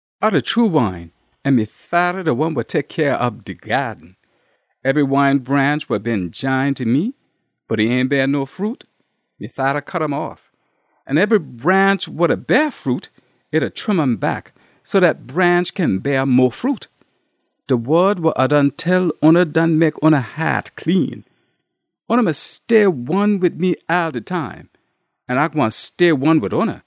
“A de true wine, an me Fada de one wa tek cyah ob de gyaaden. Ebry wine branch wa been jine ta me bot e ain beah no fruit, me Fada cut um off. An ebry branch wa da beah fruit, e da trim um back so dat branch kin beah mo fruit. De wod wa A done tell oona done mek oona haat clean. Oona mus stay one wid me all de time, an A gwine stay one wid oona.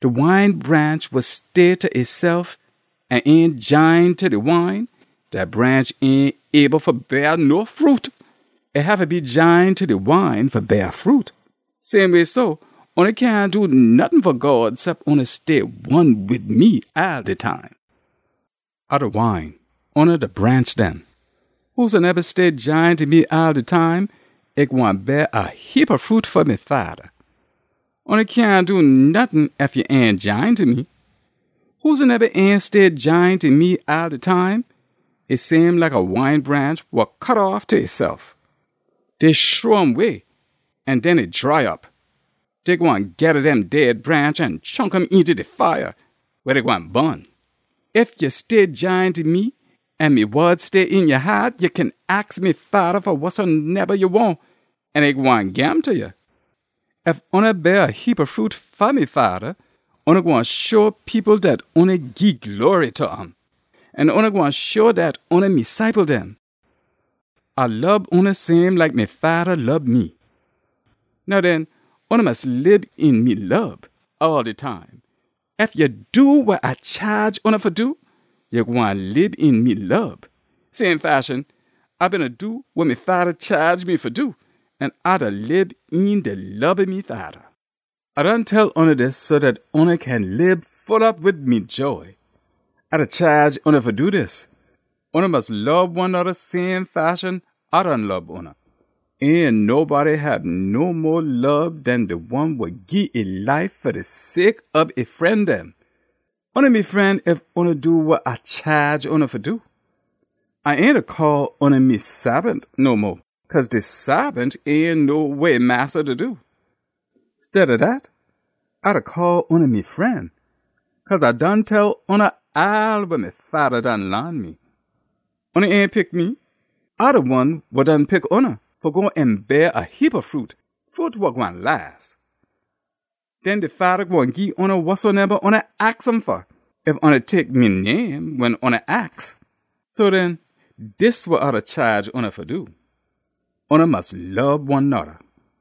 De wine branch wa stay ta esef an ain jine ta de wine, dat branch ain able fa beah no fruit. E haffa be jine ta de wine fa beah fruit. Same way so, oona cyahn do nottin fa God cep oona stay one wid me all de time. “A de wine. Oona de branch dem. Whosoneba stay jine ta me all de time, e gwine beah a heapa fruit fa me Fada. Oona cyahn do nottin ef ya ain jine ta me. Whosoneba ain stay jine ta me all de time, e same like a wine branch wa cut off ta esef. Dey shrow um way an den e dry op. Dey gwine geda dem dead branch an chunk um eenta de fire, weh dey gwine bun. Ef ya stay jine ta me an me wod stay een ya haat, ya kin aks me Fada fa wasoneba ya wahn an e gwine gim ta ya. Ef oona beah a heapa fruit fa me Fada, oona gwine show people dat oona gii glory ta um, an oona gwine show dat oona me ciple dem. A lob oona same like me Fada lob me. Now den, oona mus lib een me lob all de time. Ef ya do wa A chaage oona fa do, ya gwine lib een me lob. Same fashion, A beena do wa me Fada chaage me fa do, an A da lib een de lob ob me Fada. “A done tell oona dis so dat oona kin lib full op wid me joy. A da chaage oona fa do dis: Oona mus lob one noda same fashion A done lob oona. Ain nobody hab no mo lob den de one wa gii e life fa de sake ob e fren dem. Oona me fren ef oona do wa A chaage oona fa do. A ain da call oona me saabant no mo, cause de saabant ain know wa e massa da do. Steada dat, A da call oona me fren, cause A done tell oona all wa me Fada done laan me. Oona ain pick me. A de One wa done pick oona, fa go an beah a heapa fruit, fruit wa gwine las. Den de Fada gwine gii oona wasoneba oona aks um fa, ef oona tek me name wen oona aks. So den, dis wa A da chaage oona fa do, ‘Oona mus lob one noda.’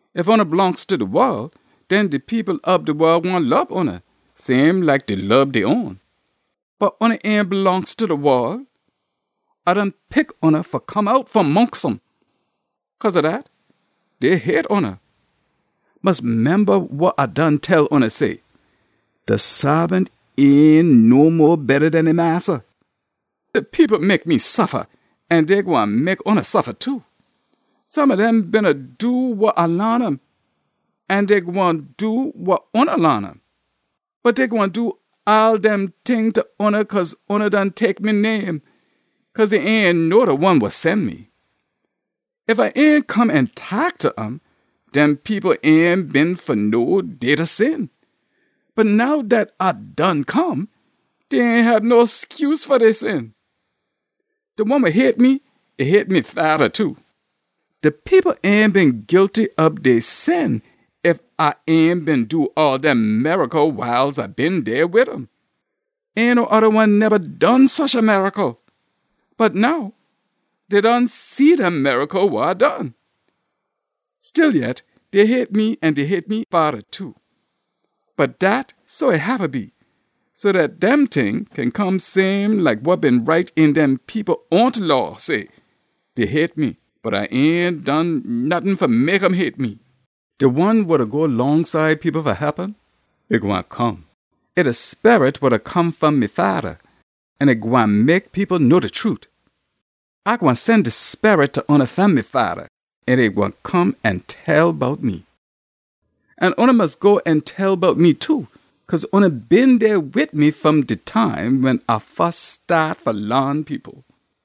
Ef oona blongst ta de wol, den de people ob de wol gwine lob oona, same like dey lob dey own. Bot oona ain blongst ta de wol. A done pick oona fa come out fom mongst um. Cause ob dat, dey hate oona. Mus memba wa A done tell oona say: ‘De saabant ain no mo betta den e massa.’ De people mek me suffa, an dey gwine mek oona suffa too. Some ob dem beena do wa A laan um, an dey gwine do wa oona laan um. Bot dey gwine do all dem ting ta oona cause oona done tek me name, cause dey ain know de One wa sen me. Ef A ain come an taak ta um, dem people ain been fa know dey da sin. Bot now dat A done come, dey ain hab no scuse fa dey sin. De one wa hate me, e hate me Fada too. De people ain been guilty ob dey sin ef A ain beena do all dem miracle wiles A been dey wid um. Ain no oda one neba done susha miracle. Bot now dey done see dem miracle wa A done. Stillyet, dey hate me an dey hate me Fada too. Bot dat so e haffa be, so dat dem ting kin come same like wa been write een dem people own Law say, ‘Dey hate me, bot A ain done nottin fa mek um hate me.’ “De One wa da go longside people fa hep um, e gwine come. E de Sperit wa da come fom me Fada, an e gwine mek people know de trute. A gwine sen de Sperit ta oona fom me Fada, an e gwine come an tell bout me. An oona mus go an tell bout me too, cause oona been dey wid me fom de time wen A fus staat fa laan people.”